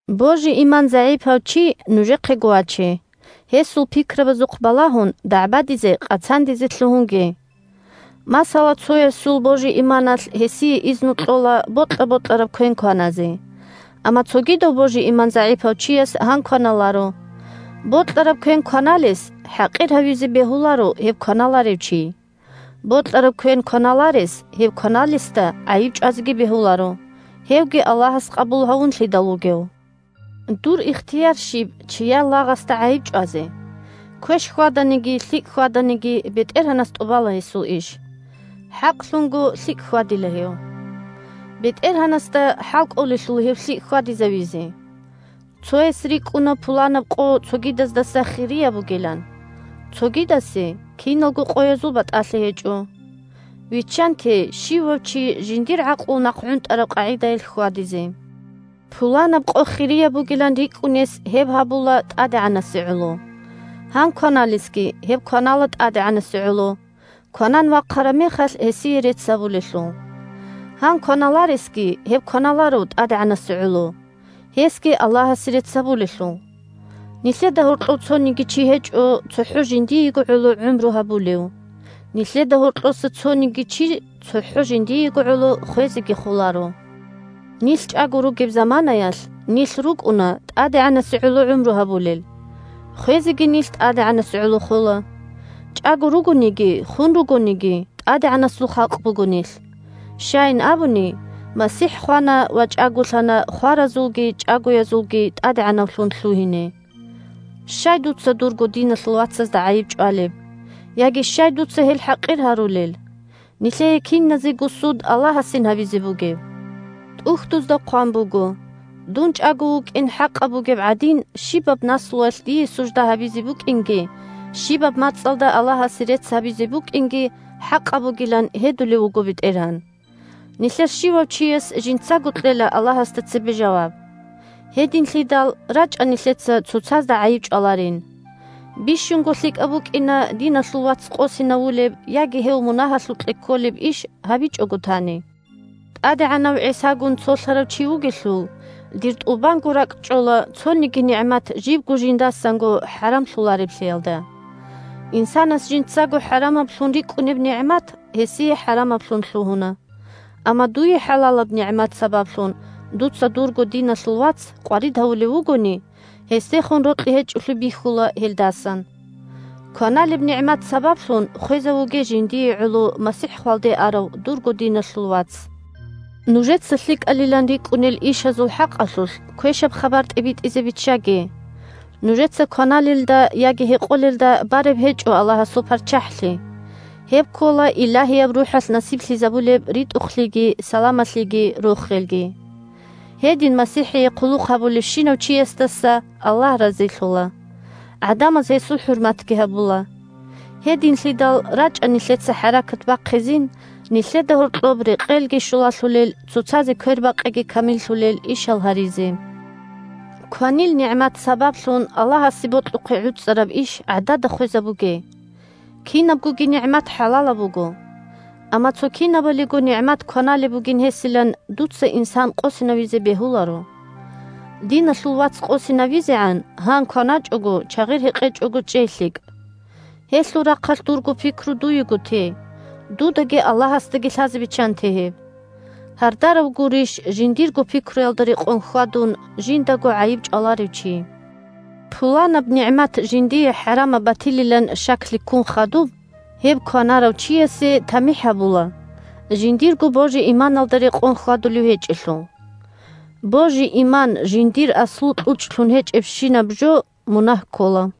Божи-иман загӀипав чи нужехъего ваче, гьесул пикрабазухъ балагьун дагӀбадизе-къацандизе лъугьунге. Масала, цоясул божи-иманалъ гьесие изну кьола бокьа-бокьараб квен кваназе. Амма цогидав божи-иман загӀипав чияс гьан кваналаро. Бокьараб квен кваналес хӀакъир гьавизе бегьуларо гьеб кваналарев чи. Бокьараб квен кваналарес гьеб кваналесда гӀайиб чӀвазеги бегьуларо, – гьевги Аллагьас къабул гьавунлъидал вугев. Дур ихтияр щиб чияр лагъасда гӀайиб чӀвазе? Квеш хьваданиги, лъикӀ хьваданиги, бетӀергьанас тӀубала гьесул иш. ХӀакълъунго лъикӀ хьвадила гьев. БетӀергьанасда хӀалкӀолелъул гьев лъикӀ хьвадизавизе. Цояс рикӀкӀуна пуланаб къо цогидаздаса хирияб бугилан. Цогидасе киналго къоязул батӀалъи гьечӀо. Виччанте щивав чи жиндир гӀакълу нахъгӀунтӀараб къагӀидаялъ хьвадизе. Пуланаб къо хирияб бугилан рикӀкӀунес гьеб гьабула ТӀадегӀанасе гӀоло. Гьан кваналесги гьеб кванала ТӀадегӀанасе гӀоло, кванан вахъараб мехалъ гьесие рецц гьабулелъул. Гьан кваналаресги гьеб кваналаро ТӀадегӀанасе гӀоло – гьесги Аллагьасе рецц гьабулелъул. Нилъеда гьоркьов цониги чи гьечӀо цохӀо жиндиего гӀоло гӀумру гьабулев, нилъеда гьоркьоса цониги чи цохӀо жиндиего гӀоло хвезеги холаро. Нилъ чӀаго ругеб заманаялъ, нилъ рукӀуна ТӀадегӀанасе гӀоло гӀумру гьабулел. Хвезеги нилъ ТӀадегӀанасе гӀоло хола. ЧӀаго ругониги, хун ругониги – ТӀадегӀанасул халкъ буго нилъ. Щайин абуни, МасихӀ хвана ва чӀаголъана хваразулги чӀагоязулги ТӀадегӀанавлъун лъугьине. Щай дуца дурго диналъул вацазда гӀайиб чӀвалеб? Яги щай дуца гьел хӀакъир гьарулел? Нилъее киназего суд Аллагьасин гьабизе бугеб. ТӀухьдузда хъван буго: «Дун чӀаго вукӀин хӀакъаб бугеб гӀадин, щибаб наслуялъ дие сужда гьабизе букӀинги, щибаб мацӀалда Аллагьасе рецц гьабизе букӀинги хӀакъаб бугилан гьедулев вуго БетӀергьан». Нилъер щивав чияс жинцаго кьела Аллагьасда цебе жаваб. Гьединлъидал, рачӀа нилъеца цоцазда гӀайиб чӀваларин. Бищунго лъикӀаб букӀина диналъул вац къосинавулеб яги гьев мунагьалъукье кколеб иш гьабичӀого тани. ТӀадегӀанав ГӀисагун цолъарав чи вугелъул, дир тӀубанго ракӀчӀола цониги нигӀмат жибго жиндасанго хӀарамлъулареблъиялда. Инсанас жинцаго хӀарамаблъун рикӀкӀунеб нигӀмат гьесие хӀарамаблъун лъугьуна. Амма дуе хӀалалаб нигӀмат сабаблъун дуца дурго диналъул вац къварид гьавулев вугони, гьесдехун рокьи гьечӀолъи бихьула гьелдасан. Кваналеб нигӀмат сабаблъун хвезавуге жиндие гӀоло МасихӀ хвалде арав дурго диналъул вац. Нужеца лъикӀалилан рикӀкӀунел ишазул хӀакъалъулъ квешаб хабар тӀибитӀизе биччаге. Нужеца кваналелда яги гьекъолелда бараб гьечӀо Аллагьасул ПарччахӀлъи. Гьеб ккола Илагьияб РухӀалъ насиблъизабулеб ритӀухълъиги, саламалъиги, рохелги. Гьедин МасихӀие хъулухъ гьабулевщинав чиясдаса Аллагь разилъула, гӀадамаз гьесул хӀурматги гьабула. Гьединлъидал, рачӀа нилъеца хӀаракат бахъизин нилъеда гьоркьоб рекъелги щулалъулел, цоцазе квербакъиги камиллъулел ишал гьаризе. Кванил нигӀмат сабаблъун Аллагьасе бокьухъе гӀуцӀараб иш гӀадада хвезабуге. Кинабгоги нигӀмат хӀалалаб буго. Амма цо кинабалиго нигӀмат кваналеб бугин гьесилан дуца инсан къосинавизе бегьуларо. Диналъул вац къосинавизегӀан, гьан кваначӀого, чагъир гьекъечӀого чӀей лъикӀ. Гьелъул рахъалъ дурго пикру дуего те, дудаги Аллагьасдаги лъазе биччанте гьеб. Гьардарав гурищ, жиндирго пикруялда рекъон хьвадун, жиндаго гӀайиб чӀваларев чи. Пуланаб нигӀмат жиндие хӀарамаб батилилан щаклъи ккун хадуб, гьеб кванарав чиясе тамихӀ гьабула, – жиндирго божи-иманалда рекъон хьвадулев гьечӀелъул. Божи-иман жиндир аслу-кьучӀлъун гьечӀебщинаб жо мунагь ккола.